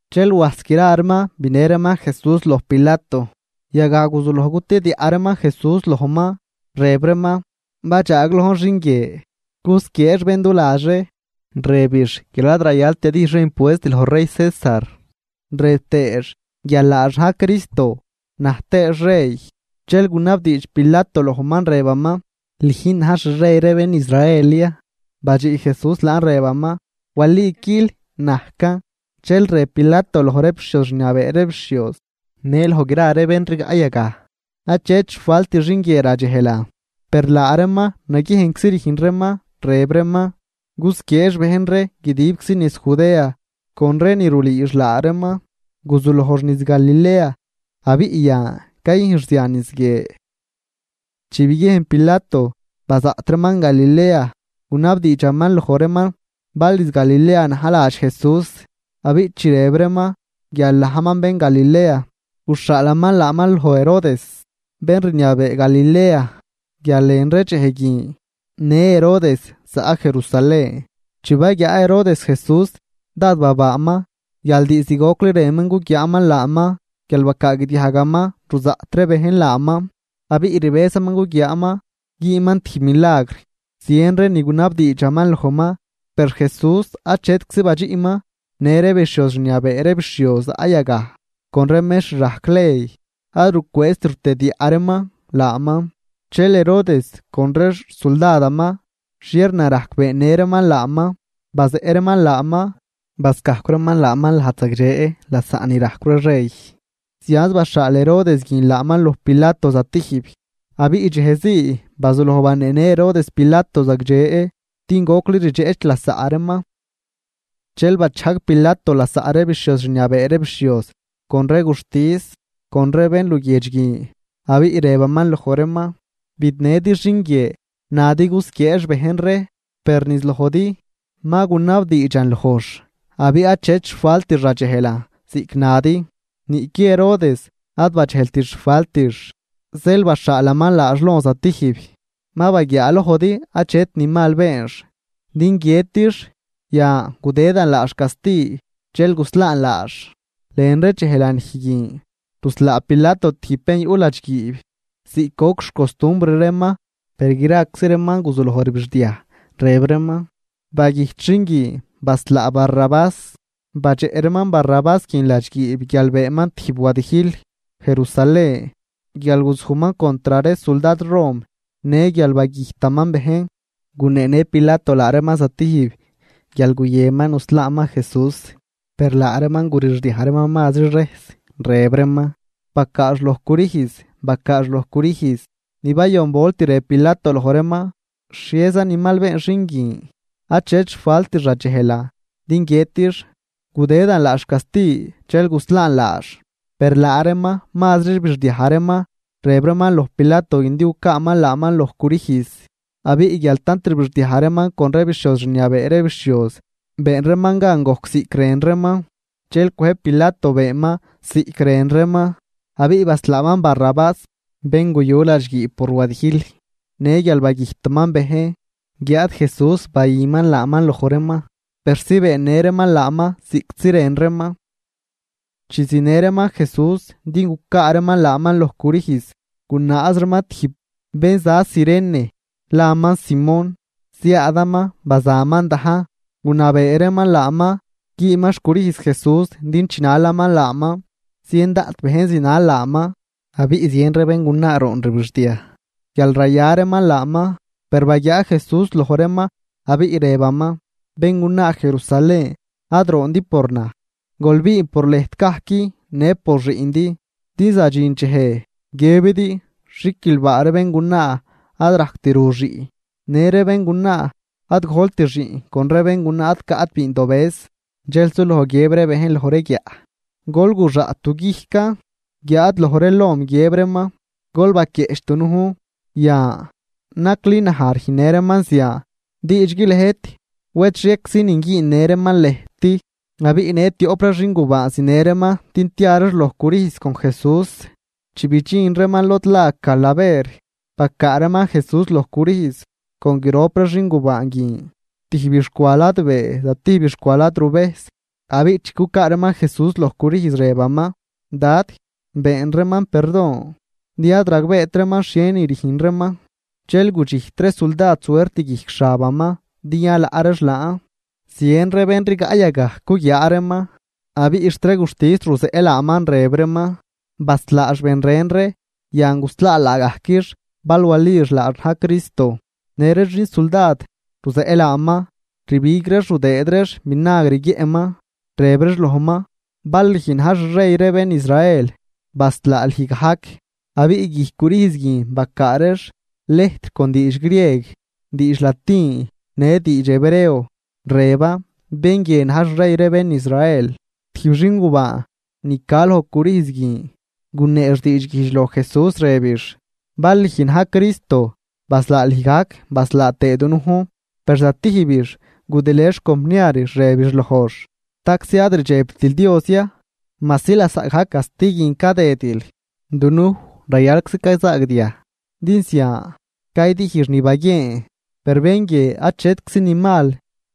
Dxel wajs gra reeman binë reeman Jesús loj Pilato. Yagaj guzuloj cutediaꞌ reeman Jesús lojman, rëb reeman: ―Badxaaglojn xin guie cusquieex bén du ladx ree, rëbix guial ad rayalt yadijx ree impuest loj rey César, rëb tëëx guial laax na̱j Cristo, na̱j tëëx rey. Dxel gunabdiidx Pilato lojman rëbaman: ―¿Lüjn na̱j xrey ree bén Israel ya? Badxiꞌ Jesús laan, rëbaman: ―Waliquil, najcan. Dxel rëb Pilato loj ree bixhioz rniabee ree bixhioz në loj gra ree bén rigaꞌ yagaj: ―Achet xfalt xin guie radxejlan. Per laa reeman naguiejnczi rüjn reeman, rëb reeman: ―Cusquieex bejn ree guidib niz Judea con ree ni rulüüx laa reeman. Guzulojx niz Galilea abiꞌ yan cayüjnx zian niz guie. Chi biguiejn Pilato bazaꞌt reeman Galilea, gunabdiidxaman loj reeman bal niz Galilea na̱j ladx Jesús. Abiꞌ chi rëb reeman guial najman bén Galilea, guxhaalaman laaman loj Herodes bén rniabee Galilea, guial lën ree dxej guin në Herodes zaꞌ Jerusalén. Chi baguiaa Herodes Jesús dád babaaman guial diizd gocli rënman guguiaaman laaman guial bacaagdiajgaman ruzaꞌt ree bejn laaman, abiꞌ rbëzaman guguiaaman güünman tijb milagr. Zien ree ni gunabdiidxaman lojman, per Jesús achetczi badxiꞌman. Në ree bixhioz rniabee ree bixhioz zaꞌ yagaj con ree mextr rajc ley, ad rucwëëzt rutediaꞌ reeman laaman. Dxel Herodes con ree xsuldadaman xhiernarajc beennë reeman laaman, bazeꞌ reeman laaman, bascajcw reeman laaman lajd zagdxe lasaꞌ ni rajcw ree rey. Zianz baxhaal Herodes guin laaman loj Pilato zatijb. Abiꞌ dxejzii bazuloj baneenë Herodes Pilato zagdxe, din gocli rdxeꞌch lasaꞌ reeman. Dxel bachajg Pilato lasaꞌ ree bixhioz rniabee ree bixhioz con ree guxtis, con ree bén luguiedx guin, abiꞌ rëbaman loj reeman: ―Bidnëdi xin guie nadi cusquieex bejn ree. Per niz lojdi ma gunabdiidxan lojx abiꞌ achet xfaltix radxejlan ziꞌc nadi. Niꞌqui Herodes ad badxejlt xfaltix, zeel baxhaalaman laax lon zatijb. Ma baguiaalojdi achet ni mal beenx din guiëtix. Yan, gudëdan laax casti dxel guslaan laax. Lën ree dxej lanij guin ruslaa Pilato tijb bén yuꞌ ladxguiib ziꞌc goc xcostumbr reeman. Per graczi reeman guzuloj rbixdiaj, rëb reeman: ―¡Bagüjt xin guin! ¡Baslaa Barrabás! Badxeꞌ reeman Barrabás guin ladxguiib guial beenman tijb wadijl Jerusalén, guial guzujman contr ree suldad rom, në guial bagüjtaman bejn. Guneenë Pilato laa reeman zatijb guial guyënman nuslaaman Jesús, per laa reeman gurixdiaj reeman mazri rejs, rëb reeman: ―¡Bacaax loj crüjz! ¡Bacaax loj crüjz! Ni bayon volt rëb Pilato loj reeman: ―¿Xhieza ni mal been xin guin? Achet xfaltix radxejlan din guiëtix. Gudëdan laax casti dxel guslaan laax. Per laa reeman mazri rbixdiaj reeman, rëb reeman loj Pilato din gucaaman laaman loj crüjz. Abiꞌ guial tant rbixdiaj reeman con ree bixhioz rniabee ree bixhioz, been reeman gan gojc ziꞌc rën reeman. Dxel cwëjb Pilato beenman ziꞌc rën reeman. Abiꞌ baslaaman Barrabás bén guyu ladxguiib por wadijl në guial bagüjtaman bejn, guiáad Jesús bayüman laaman loj reeman persi beennë reeman laaman ziꞌctzi rën reeman. Chi zinë reeman Jesús din gucaa reeman laaman loj crüjz, gunaaz reeman tijb bén za Cirene laaman Simón. Ziaadaman bazaman dajn, gunabee reeman laaman güüman xcrüjz Jesús din chinalaman laaman. Zien daꞌt bejn zinal laaman, abiꞌ zien ree béngunaa roon rbixdiaj guial raya reeman laaman. Per baguiaa Jesús loj reeman abiꞌ rëbaman: ―Béngunaa Jerusalén ad roondi por naj, gol biin por lëjt gajc në por xiꞌndi. Din zadxin dxej guiëbidi: “Xiquilbaa ree béngunaa ad rajct ru xiꞌn, në ree béngunaa ad gojlt xiꞌn con ree béngunaa ad caꞌt bindobëz.” Dxel suloj guiëb ree bejn loj ree guiaꞌ: “Gol guxaꞌt du guijcan”, guiáad loj ree lom guiëb reeman: “Gol baquieꞌch dunujn.” Yan, nacli naj rüjnnë reeman zian, diidxgui lëjt, wed xhieczinin güünnë reeman lëjt. Abiꞌ në tioꞌp ree xingubaan zinë reeman din tia reex loj crüjz con Jesús. Chi bidxin reeman lod la Calaver, bacaa reeman Jesús loj crüjz, con grop ree xingubaan guin: tijbix cwa ladbee zatijbix cwa ladruvejs. Abiꞌ chi cucaa reeman Jesús loj crüjz, rëbaman: ―Dad, been reeman perdon, din ad ragbeet reeman xhienin rüjn reeman. Dxel gudxijt ree suldad suert guijc xabaman din yalaꞌ reex laan. Zien ree bejn rigaꞌ yagaj cuguiaa reeman, abiꞌ xt ree guxtis ruzeꞌ laaman, rëb reeman: ―Baslaax ben ren ree, yan guslaa laagajquix bal walix laax na̱j Cristo. Në ree xin suldad ruzeꞌ laaman, rbig reex rudëëd reex vinagr guiëꞌman, rëb reex lojman: ―Bal lüj na̱j xrey ree bén Israel, baslaa lüj gajc. Abiꞌ guijc crüjz guin bacaa reex lëjtr con diidx grieg, diidx latin, në diidx hebreo, rëban: “Bén guie na̱j xrey ree bén Israel.” Tijb xingubaan ni ca loj crüjz guin guneex diidxguijdx loj Jesús, rëbix: ―Bal lüj na̱j Cristo, baslaa lüj gajc, baslaa tëë dunujn. Per zatijbix gudilë xcompniarix, rëbix lojx: ―¿Staczi ad rdxebtil Dios ya majsi lasaꞌgajc casti guin cadëdil? Dunuj rayalczi cayzaagdiaj din zian caydijx ni baguieen. Per bén guie achetczi ni mal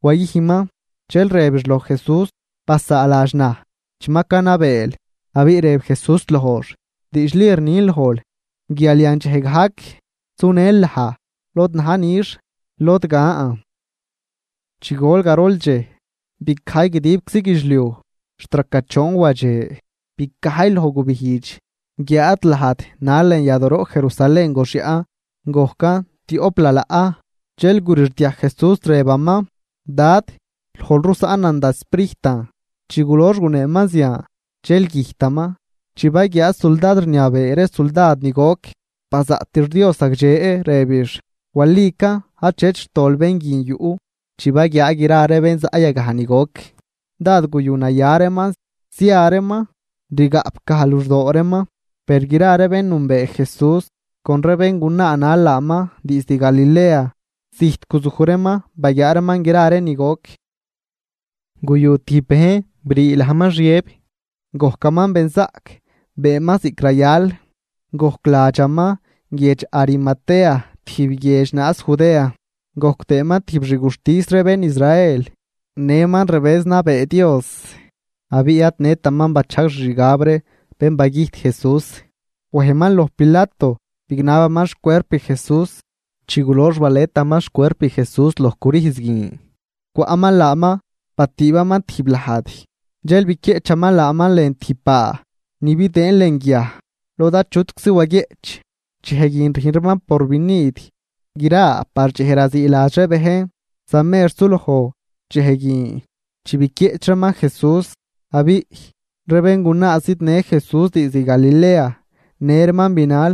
wayüjnman. Dxel rëbix loj Jesús: ―Basaaladx naj chi ma canabeel. Abiꞌ rëb Jesús lojx: ―Diidxli rnin lojl guial yandxej gajc sunël naj lod na̱j nix, lod gan. Chi gol garol dxej, bicajy guidibczi guidxliuj xt raca choon wadxe. Bicajy logbijdx guiáad lajd nal lën yadooroꞌ Jerusalén goxyaꞌn, gojcan tioꞌp lalaꞌ. Dxel gurixdiaj Jesús, rëbaman: ―Dad, lojl rusaꞌn da sprijtan. Chi gulox guneeman zian, dxel güjtaman. Chi baguiaa suldad rniabee ree suldad ni goc, bazaꞌtix Dios zagdxe, rëbix: ―Walican achet xtol bén guin yuꞌ. Chi baguiaa gra ree bén zaꞌ yagaj ni goc, dád guyunaya reeman zia reeman rigaꞌpgaj luxdoo reeman. Per gra ree bén nünbee Jesús, con ree béngunaa nal laaman diizd Galilea, zijt guzuj reeman baguiaa reeman gra ree ni goc. Guyu tijb bejn, brii lajman Xiëb, gojcaman benzaꞌc, beenman ziꞌc rayal. Gojc ladxaman guiedx Arimatea tijb guiedx naaz Judea. Gojc tëëman tijb xguxtis ree bén Israel. Nëman rbëz nabee Dios, abiꞌ ad nëtaman bachajg xixgab ree bén bagüjt Jesús. Wejman loj Pilato bignabaman xcuerp Jesús. Chi gulox baletaman xcuerp Jesús loj crüjz guin, cwaꞌman laaman batüübaman tijb lajd, dxel biquieꞌchaman laaman lën tijb baa ni bidëën lën guiaj lod achutczi waguieꞌch. Dxej guin rüjn reeman porvinid gra par dxej raziiladx ree bejn. Zamer suloj dxej guin chi biquieꞌch reeman Jesús. Abiꞌ ree béngunaa zidnë Jesús diizd Galilea, në reeman binal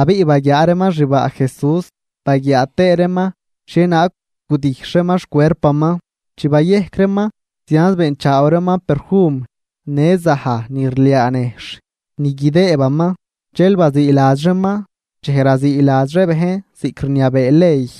abiꞌ baguiaa reeman xbaa Jesús baguiaa tëë reeman xhienaag gudijxh reeman xcuerpaman. Chi bayejc reeman, zianz beenchaaw reeman perfum në zaj ni rliaa nejxh ni guidëëbaman. Dxel baziiladx reeman dxej raziiladx ree bejn ziꞌc rniabee ley.